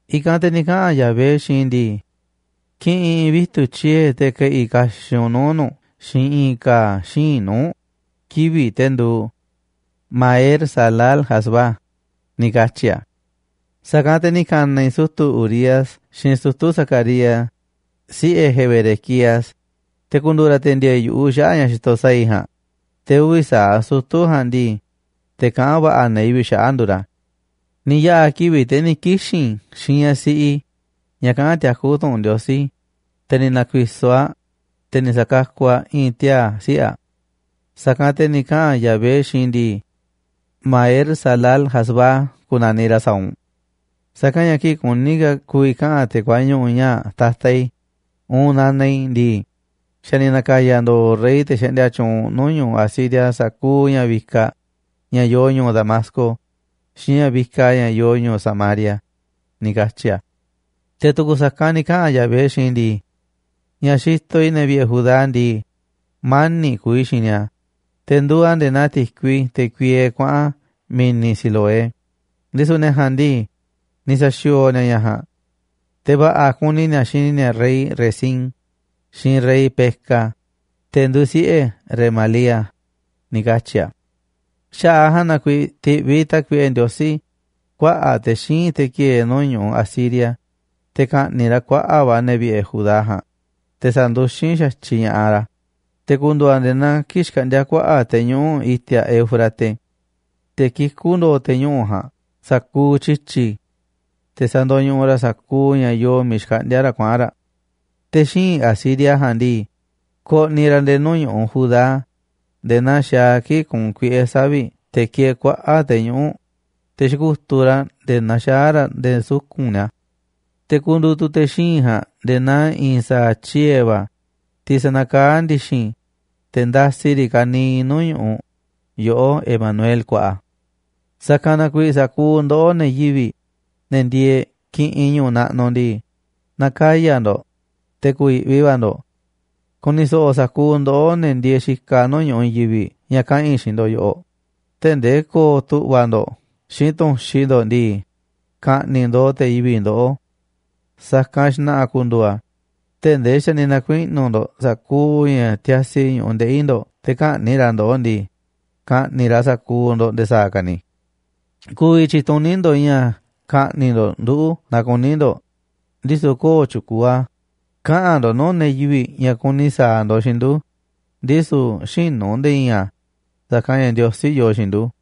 I̱kanꞌ te̱ ni̱ kaꞌa̱n Yahvé xiinꞌ i̱ ndii: “Ki̱ꞌi̱n i̱i̱n vitu̱ꞌ tyiee̱ te̱ ke̱ꞌi̱ kaxiꞌ u̱nꞌ nuu̱ꞌ nu̱ꞌ xiinꞌ i̱i̱n ka̱a̱ xíinꞌ nuu̱ꞌ kivi̱ꞌ te̱ nduuꞌ: Maher-salal-hazbaz”, ni katyi̱ a̱. Sa̱kanꞌ te̱ ni̱ ka̱na̱ i̱ sutu̱ Urías xiinꞌ sutu̱ Zacarías, siꞌe̱ Jeberequías, te̱ ku̱ndu̱u̱ ra̱ te̱ ndi̱e̱e̱ yu̱ꞌuꞌ xaꞌa̱ꞌ ña̱ xitoꞌ sa̱a̱ i̱ ja̱a̱nꞌ, te̱ uvi̱ sa̱aꞌ sutu̱ ja̱a̱nꞌ ndii, te̱ kaꞌán va̱ꞌa̱ ne̱ yivi̱ꞌ xaꞌa̱ꞌ nduuꞌ ra̱. Ni̱ yaꞌa̱ kivi̱ꞌ, te̱ ni̱ kixi̱n i̱ xiinꞌ ñaꞌ siꞌi i̱ ñaꞌ kaꞌán tiakú tu̱ꞌu̱n Ndiosí, te̱ ni̱ na̱ku̱i̱so̱ aꞌ, te̱ ni̱ sa̱kakuꞌ aꞌ i̱i̱n tiaa̱ siꞌe̱ aꞌ. Sa̱kanꞌ te̱ ni̱ kaꞌa̱n Yahvé xiinꞌ i̱ ndii: “Maher-salal-hasbaz ku̱na̱niꞌ ra̱ sa̱a̱ u̱nꞌ. Sa̱kanꞌ ña̱ kii̱ꞌ kuní ka̱ ku̱vi̱ kaꞌa̱n te̱ kuañuꞌu̱ ñaa̱ꞌ, “Tata i̱” uun “Nana i̱” ndii, xa̱ ni̱ na̱ka̱ya̱ ndo̱o̱ rey, te̱ xaꞌndia tyuunꞌ nuu̱ꞌ ñu̱ꞌuꞌ Asiria sa̱kuuꞌ ña̱ vikaꞌ ña̱ yoo ñu̱u̱ Damasco xiinꞌ ña̱ vikaꞌ ña̱ yoo ñu̱u̱ Samaria”, ni̱ katyi̱ a̱. Te̱ tu̱ku̱ sa̱kanꞌ ni̱ kaꞌa̱n Yahvé xiinꞌ i̱ ndii: “Ña̱ xitoꞌ i̱ ne̱ vi̱ꞌe̱ Judá ndii, mani̱ꞌ kuuꞌ i̱ xiinꞌ ni̱a̱, te̱ nduuꞌ a̱ nde̱e̱ naa ti̱kui, te̱ kuiee kuaꞌa̱n mi̱ni̱ Siloé, ndisu̱ ne̱ ja̱a̱nꞌ ndii, ni̱ sa̱xi̱o̱o̱ ni̱a̱ ña̱ ja̱a̱nꞌ. Te̱ va̱ꞌa̱ kuni ni̱a̱ xini ni̱a̱ rey Rezín xiinꞌ rey Peka, te̱ nduuꞌ siꞌe̱ Remalía”, ni̱ katyi̱ a̱. Xaꞌa̱ꞌ a̱ ja̱a̱nꞌ na kuiiꞌ ti̱ꞌviꞌ Tákuiꞌe Ndiosí kuaꞌa̱ꞌ te̱ xíinꞌ, te̱ ki̱e̱e̱ nuu̱ꞌ ñu̱ꞌuꞌ Asiria, te̱ ka̱ꞌni̱ꞌ ra̱ kuaꞌa̱ꞌ va̱ ne̱ vi̱ꞌe̱ Judá ja̱a̱nꞌ, te̱ sa̱nduxín xa̱tyiꞌ ña̱ꞌaꞌ ra̱, te̱ ku̱ndu̱u̱ a̱ nde̱e̱ naa kii̱ꞌ xkaꞌndíá kuaꞌa̱ꞌ te̱ñuꞌu̱ꞌ i̱ti̱a̱ Eufrate. Te̱ kikú ndo̱o̱ te̱ñuꞌu̱ꞌ ja̱a̱nꞌ sa̱kuuꞌ tyi̱tyi̱, te̱ sandoñuꞌuꞌ raꞌ sa̱kuuꞌ ña̱ yoo miiꞌ xkaꞌndíá raꞌ kuaꞌa̱n raꞌ. Te̱ xíinꞌ Asiria ja̱a̱nꞌ ndii, ko̱ꞌni̱ ra̱ nde̱e̱ nuu̱ ñu̱ꞌuꞌ Judá nde̱e̱ naa xaaꞌ a̱ kii̱ꞌ kuunꞌ kuiꞌe̱ savi̱ꞌ te̱ kieeꞌ kuaꞌa̱ꞌ te̱ñuꞌu̱ꞌ, te̱ xiku̱tuꞌ raꞌ nde̱e̱ naxaá raꞌ nde̱e̱ suku̱nꞌ ni̱a̱. Te̱ ku̱ndu̱u̱ tu̱ te̱ xíinꞌ ja̱a̱nꞌ nde̱e̱ naa i̱i̱n sa̱a̱ tyiee̱ va̱, tiꞌ sa̱na̱kaá ndi̱xi̱n, te̱ nda̱si̱ riꞌ ka̱niiꞌ nuu̱ꞌ ñu̱ꞌuꞌ yoꞌó, Emanuel kuaꞌa. Sa̱kanꞌ na kuiiꞌ, sa̱kuuꞌ ndoꞌó, ne̱ yivi̱ꞌ, ne̱ ndieeꞌ kiꞌinꞌ ñu̱u̱ naꞌnuꞌ ndii, na̱kaya̱ ndo̱ꞌ, te̱ ku̱yi̱ꞌvi va̱ ndo̱ꞌ. Ku̱ni̱ so̱ꞌo̱ sa̱kuuꞌ ndoꞌó, ne̱ ndieeꞌ xikaꞌ nuu̱ꞌ ñu̱ꞌuꞌ i̱i̱n yivi̱ꞌ, ña̱ kaꞌa̱n i̱ xiinꞌ ndo̱ꞌ yoꞌoꞌ tee̱ꞌ ndee ko̱o̱ tu̱ꞌva̱ ndo̱ꞌ xiinꞌ tu̱nxi ndo̱ꞌ ndii, ka̱ꞌni̱ꞌ ndooꞌ te̱ yivi̱ꞌ ndoꞌó. Sa̱kanꞌ xna̱ꞌa̱ ku̱ndu̱u̱ a̱ tee̱ꞌ ndee xa̱ ni̱ na̱kuiꞌnu̱ ndo̱ꞌ sa̱kuuꞌ ña̱ tiasi ñu̱ꞌuꞌ ndeꞌi̱ ndo̱ꞌ te̱ kä̱ꞌni̱ꞌ ra̱ ndoꞌó ndii, ka̱ꞌni̱ꞌ ra̱ sa̱kuuꞌ ndo̱ꞌ nde̱e̱ sa̱a̱ ka̱ ni̱. Ku̱vi̱ tyi̱tuní ndo̱ꞌ ña̱ ka̱ꞌni̱ꞌ ndo̱ꞌ nduꞌu̱ naaꞌ kuní ndo̱ꞌ, ndisu̱ köo̱ꞌ tyukuuꞌ a̱. Kaꞌa̱n ndo̱ꞌ nuu̱ꞌ ne̱ yivi̱ꞌ ña̱ kuni sa̱a̱ ndo̱ꞌ xiinꞌ ndu̱, ndisu̱ xïnu̱ nde̱e̱ i̱i̱n a̱, sa̱kanꞌ ña̱ Ndiosí yoo xiinꞌ ndu̱.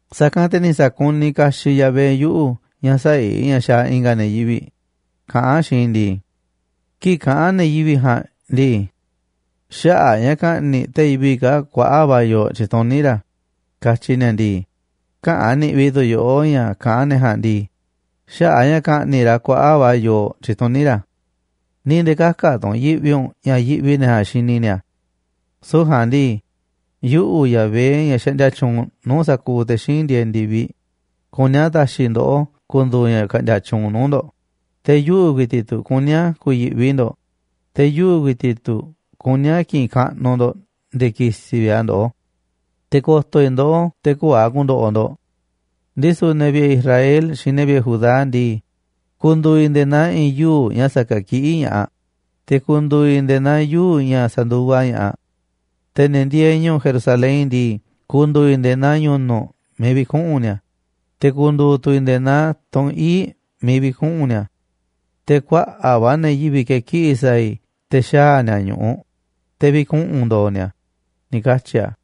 Sa̱kanꞌ te̱ ni̱ sa̱kuniꞌ kaxiꞌ Yahvé yuꞌu̱ ña̱ sä̱a̱ i̱ ña̱ xaaꞌ i̱nga̱ ne̱ yivi̱ꞌ, kaꞌán a̱ xiinꞌ i̱ ndii: “Kii̱ꞌ kaꞌán ne̱ yivi̱ꞌ ja̱a̱nꞌ ndii: Xaꞌa̱ꞌ a̱ ña̱ ka̱ꞌni̱ꞌ te̱ yivi̱ꞌ kaa̱ꞌ kuaꞌa̱ꞌ va̱ yooꞌ tyituní ra̱, katyi ni̱a̱ ndii, käꞌán niꞌvi tu̱ yoꞌó ña̱ kaꞌán ne̱ ja̱a̱nꞌ ndii, xaꞌa̱ꞌ ña̱ ka̱ꞌni̱ꞌ ra̱ kuaꞌa̱ꞌ va̱ yooꞌ tyituní ra̱. Ni̱ nde̱e̱ kä̱ka̱ tu̱ u̱nꞌ yiꞌvi u̱nꞌ ña̱ yiꞌvi ne̱ ja̱a̱nꞌ xini ni̱a̱. Süu̱ꞌ ja̱a̱nꞌ ndii, yuꞌu̱, Yahvé, ña̱ xaꞌndia tyuunꞌ nuu̱ꞌ sa̱kuuꞌ te̱ xíinꞌ ndieeꞌ ndi̱viꞌ, kuní a̱ ta̱xi̱ ndoꞌó ku̱ndu̱u̱ ña̱ ka̱ꞌndi̱a̱ tyuunꞌ nuu̱ꞌ ndo̱ꞌ, te̱ yuꞌu̱ ku̱i̱ti̱ꞌ tu̱ kuní a̱ ku̱yi̱ꞌvi ndo̱ꞌ, te̱ yuꞌu̱ ku̱i̱ti̱ꞌ tu̱ kuní a̱ ki̱ꞌi̱n kaꞌnuꞌ ndo̱ꞌ nde̱e̱ kisiꞌ vi̱ꞌ a̱ ndoꞌó. Te̱ ko̱to̱ i̱ ndoꞌó te̱ köo̱ꞌ a̱ ku̱ndo̱ꞌo̱ ndo̱ꞌ. Ndisu̱ ne̱ vi̱ꞌe̱ Israel xiinꞌ ne̱ vi̱ꞌe̱ Judá ndii, ku̱ndu̱u̱ i̱ nde̱e̱ naa i̱i̱n yuu̱ꞌ ña̱ sa̱ke̱kiꞌí ña̱ꞌaꞌ, te̱ ku̱ndu̱u̱ i̱ nde̱e̱ naa yuu̱ꞌ ña̱ sa̱nduvaꞌ ña̱ꞌaꞌ. Te̱ ne̱ ndieeꞌ ñu̱u̱ Jerusalén ndii, ku̱ndu̱u̱ i̱ nde̱e̱ naa ñu̱nu̱ꞌ miiꞌ vi̱kuꞌu̱n ni̱a̱, te̱ ku̱ndu̱u̱ tu̱ i̱ nde̱e̱ naa tunꞌ ii̱ꞌ miiꞌ vi̱kuꞌu̱n ni̱a̱. Te̱ kuaꞌa̱ꞌ va̱ ne̱ yivi̱ꞌ ke̱kiꞌi̱ sa̱a̱ i̱ te̱ xaa̱ ni̱a̱ ñu̱ꞌuꞌ, te̱ vi̱kuꞌu̱n ndo̱o̱ ni̱a̱”, ni̱ katyi̱ a̱.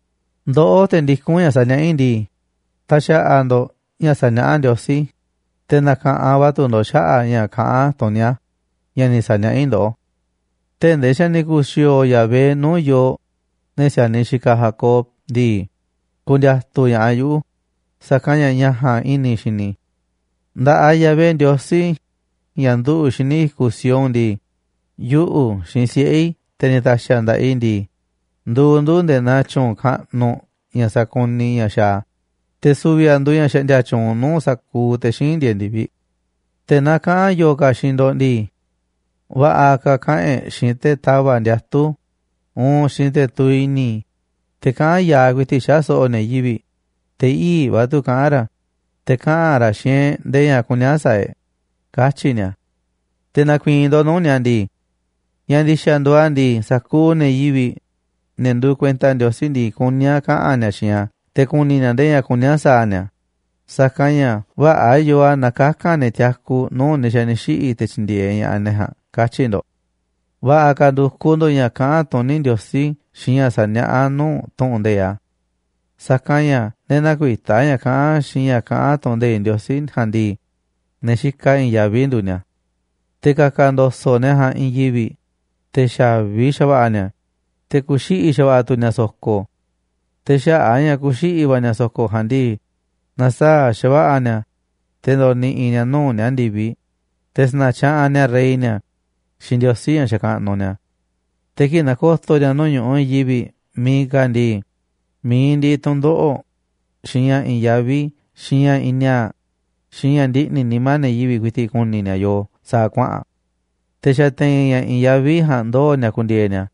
Ndoꞌó, te̱ ndikún ña̱ saniaꞌá i̱ ndii, ta̱xa̱ꞌa̱ ndo̱ꞌ ña̱ saniaꞌá Ndiosí, te̱ na̱ka̱ꞌanꞌ va̱ tu̱ ndo̱ꞌ xaꞌa̱ꞌ ña̱ kaꞌán tuní a̱ ña̱ ni̱ sa̱niaꞌá i̱ ndoꞌó. Tee̱ꞌ ndee xa̱ ni̱ ku̱xi̱o̱o̱ Yahvé nuu̱ꞌ yooꞌ, ne̱ si̱a̱niꞌ xikaꞌ Jacob ndii, ku̱ndi̱a̱tu̱ ña̱ꞌaꞌ yuꞌu̱, sa̱kanꞌ ña̱ ña̱ ja̱a̱nꞌ i̱ni̱ i̱ xini i̱. Nda̱ꞌaꞌ Yahvé Ndiosí, ña̱ nduꞌu̱ xíniꞌ i̱kuꞌ Sión ndii, yuꞌu̱ xiinꞌ siꞌe̱ i̱, te̱ ni̱ ta̱xi̱ a̱ nda̱ꞌaꞌ i̱ ndii, nduuꞌ ndu̱ꞌ nde̱e̱ naa tyu̱u̱n kaꞌnuꞌ ña̱ sakuniꞌ ña̱ xaaꞌ a̱, te̱ su̱vi̱ a̱ nduuꞌ ña̱ xaꞌndia tyuunꞌ nuu̱ꞌ sa̱kuuꞌ te̱ xíinꞌ ndieeꞌ ndi̱viꞌ. Te̱ naaꞌ kaꞌa̱n yo̱o̱ ka̱ xiinꞌ ndo̱ꞌ ndii: “Va̱ꞌa̱ ka̱ kaꞌa̱n e̱ꞌ xiinꞌ te̱ tava̱ꞌ ndiatu̱ uun xiinꞌ te̱ tuviꞌ i̱ni̱, te̱ kaꞌán ya̱aꞌ ku̱i̱ti̱ꞌ xaꞌa̱ꞌ so̱ꞌo̱ ne̱ yivi̱ꞌ, te̱ ii̱ꞌ va̱ tu̱ kaꞌán ra̱, te̱ kaꞌa̱n ra̱ xiinꞌ e̱ꞌ ndee ña̱ kuní a̱ sa̱a̱ e̱ꞌ”, katyi̱ ni̱a̱. Te̱ na̱ku̱i̱i̱n ndo̱ꞌ nuu̱ꞌ ni̱a̱ ndii: “Ña̱ ndi̱xa̱ nduuꞌ a̱ ndii, sa̱kuuꞌ ne̱ yivi̱ꞌ, ne̱ nduuꞌ kuenta Ndiosí ndii, kuní a̱ kaꞌa̱n ni̱a̱ xiinꞌ a̱ te̱ ku̱ni̱ ni̱a̱ ndee ña̱ kuní a̱ sa̱a̱ ni̱a̱, sa̱kanꞌ ña̱ vä̱ꞌa̱ yoo a̱ naaꞌ kaka̱n ne̱ tiaku nuu̱ꞌ ne̱ xa̱ ni̱ xiꞌi̱ te̱ tyi̱ndi̱e̱eꞌ ña̱ꞌaꞌ ne̱ ja̱a̱nꞌ”, katyi̱ ndo̱ꞌ. Va̱ꞌa̱ ka̱ ndu̱kuꞌ ndo̱ꞌ ña̱ kaꞌán tuní Ndiosí xiinꞌ ña̱ saniaꞌá a̱ nuu̱ꞌ tu̱ꞌu̱n nde̱iꞌ a̱, sa̱kanꞌ ña̱ ne̱ näkuitá ña̱ kaꞌán xiinꞌ ña̱ kaꞌán tu̱ꞌu̱n nde̱iꞌ Ndiosí ja̱a̱nꞌ ndii, ne̱ xikaꞌ i̱i̱n yaví nduuꞌ ni̱a̱. Te̱ ka̱ka̱ ndo̱so̱ꞌ ne̱ ja̱a̱nꞌ i̱i̱n yivi̱ꞌ, te̱ xa̱vi xa̱va̱ꞌa̱ ni̱a̱, te̱ ku̱xiꞌi̱ xa̱va̱ꞌa̱ tu̱ ni̱a̱ so̱ko̱. Te̱ xaꞌa̱ꞌ a̱ ña̱ ku̱xiꞌi̱ va̱ ni̱a̱ so̱ko̱ ja̱a̱nꞌ ndii, na̱saa̱ꞌ xa̱va̱ꞌa̱ ni̱a̱, te̱ ndo̱ꞌni̱ꞌi̱ ni̱a̱ nuu̱ꞌ ni̱a̱ ndi̱viꞌ, te̱ sa̱na̱tyaꞌanꞌ ni̱a̱ rey ni̱a̱ xiinꞌ Ndiosí ña̱ xakaꞌnuꞌ ni̱a̱. Te̱ kii̱ꞌ na̱ko̱to̱ ni̱a̱ nuu̱ꞌ ñu̱ꞌuꞌ i̱i̱n yivi̱ꞌ miiꞌ ka̱ ndii, mi̱iꞌ ndiꞌiꞌ tu̱ndoꞌo̱ꞌ, xiinꞌ ña̱ i̱i̱n yaví, xiinꞌ ña̱ i̱i̱n ni̱a̱a̱ꞌ, xiinꞌ ña̱ ndiꞌni̱ nimá ne̱ yivi̱ꞌ ku̱i̱ti̱ꞌ ku̱ni̱ ni̱a̱ yoo sa̱a̱ kuaꞌa̱n. Te̱ xa̱ te̱i̱n ña̱ i̱i̱n yaví ja̱a̱nꞌ ndoo̱ ni̱a̱ ku̱ndi̱e̱e̱ ni̱a̱,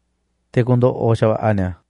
te̱ ku̱ndo̱ꞌo̱ xa̱va̱ꞌa̱ ni̱a̱.